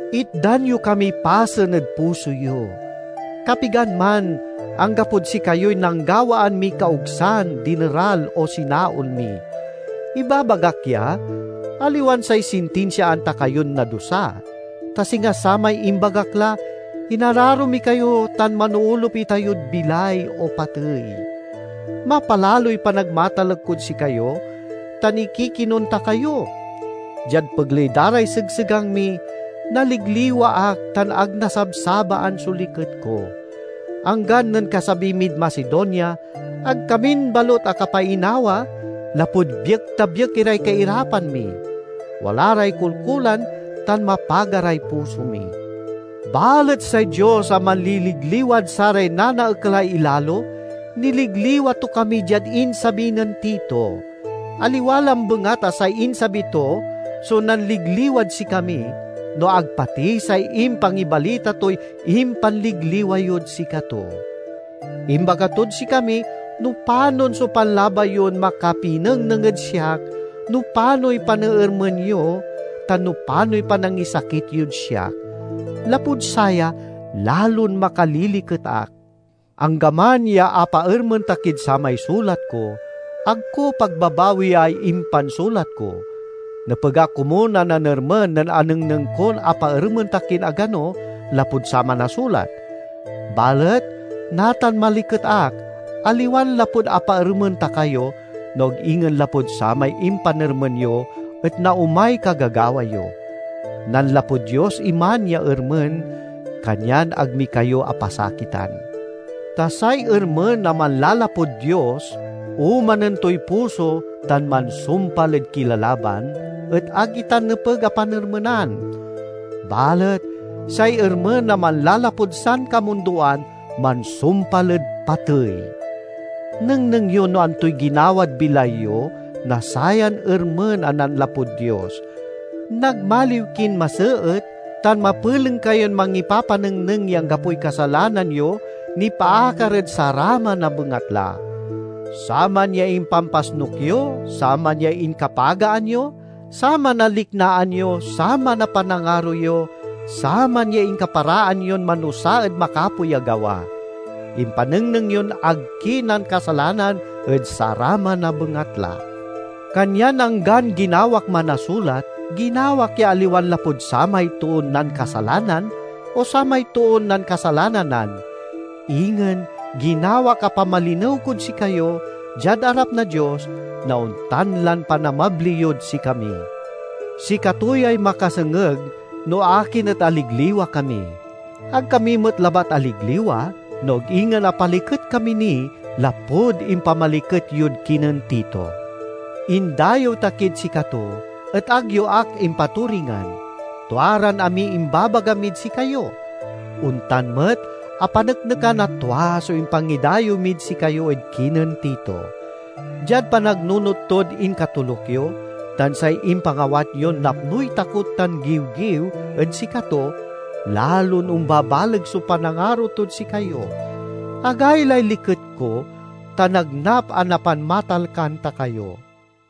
Itdan yo kamiy pasen ed puso yo. Kapigan man, anggapod sikayoy nanggawaan miy kaogsan, dineral, o sinaol mi. Ibabagak ya, aliwan say sintinsiaan ta kayon nadusa. Ta singa samay imbagak la, inararo mi kayo tan manoolup itayod bilay o patey. Mapalaloy panagmatalek kod sikayo tan ikikinon ta kayo. Diad pegley da ray segsegang mi, naliligliwa ak tan ag nasabsabaan so liket ko. Anggan nen kasabi mid Macedonia, ag kamin balut akapainawa, lapud biekta-biek iray kairapan mi; wala ray kolkolan tan mapaga ray puso mi. Balet say Dios a manliligliwad saray nanaekalay ilalo, niligliwa to kami diad insabi nen Tito. Aliwa lambengat a say insabi to so nanligliwad sikami, no ag pati say impangibalita toy impanligliwa yod sikato. Imbaga tod sikami no panon so panlabay yon makapinengneng ed siak, no panoy paneermen yo, tan no panoy panangisakit yod siak. Lapud saya, lalon makaliliket ak. Anggaman ya apaermen ta kid samay sulat ko, ag ko pagbabawiay impansulat ko. Nepeg ak komun a nanermen nen anengneng kon apaermen ta kin agano lapud saman a sulat. Balet natan maliket ak, aliwan lapud apaermen ta kayo no ag ingen lapud samay impanermen yo et naomay kagagawa yo. Nanlapud Dios iman ya ermen, kanyan ag mi kayo apasakitan. Ta say ermen a manlalapud Dios omanen toy puso tan mansumpal ed kilalaban, et ag itan nepeg a panermenan! Balet say ermen a manlalapud sankamundoan mansumpal ed patey. Nengneng yo no antoy ginawad bilay yo na sayan ermen a nanlapud Dios: nagmaliw kin maseet, tan mapeleng kayon mangipapanengneng ya anggapoy kasalanan yo nipaakar ed saraman a bengatla. Saman ya impanpasnuk yo, saman ya inkapagaan yo, saman a liknaan yo, saman a panangaro yo, saman ya inkaparaan yon manusa ed makapoy a gawa! Impanengneng yon ag ki nankasalanan ed saraman a bengatla. Kanyan anggan ginawak man a sulat, ginawak ya aliwan lapud samay toon nankasalanan o samay toon nankasalananan. Ingen ginawak a pamalinew kod sikayo, diad arap na Dios, na ontan lan panamabli yod sikami. Sikato yay makasengeg no akin et aligliwa kami. Ag kami met labat aligliwa, no ag ingen apaliket kami ni lapud impamaliket yod kinen Tito. Indayew ta kid sikato, et ag yo ak impaturingan. Tua ran amiy imbabaga mid sikayo. Ontan met apaneknekan a tua so impangidayew mid sikayo ed kinen Tito. Diad panagnunot tod inkatoluk yo, tan say impangawat yon napnoy takot tan giwgiw ed sikato, lalon ombabaleg so panangaro tod sikayo. Agaylay liket ko, ta nagnap a napanmatalkan ta kayo!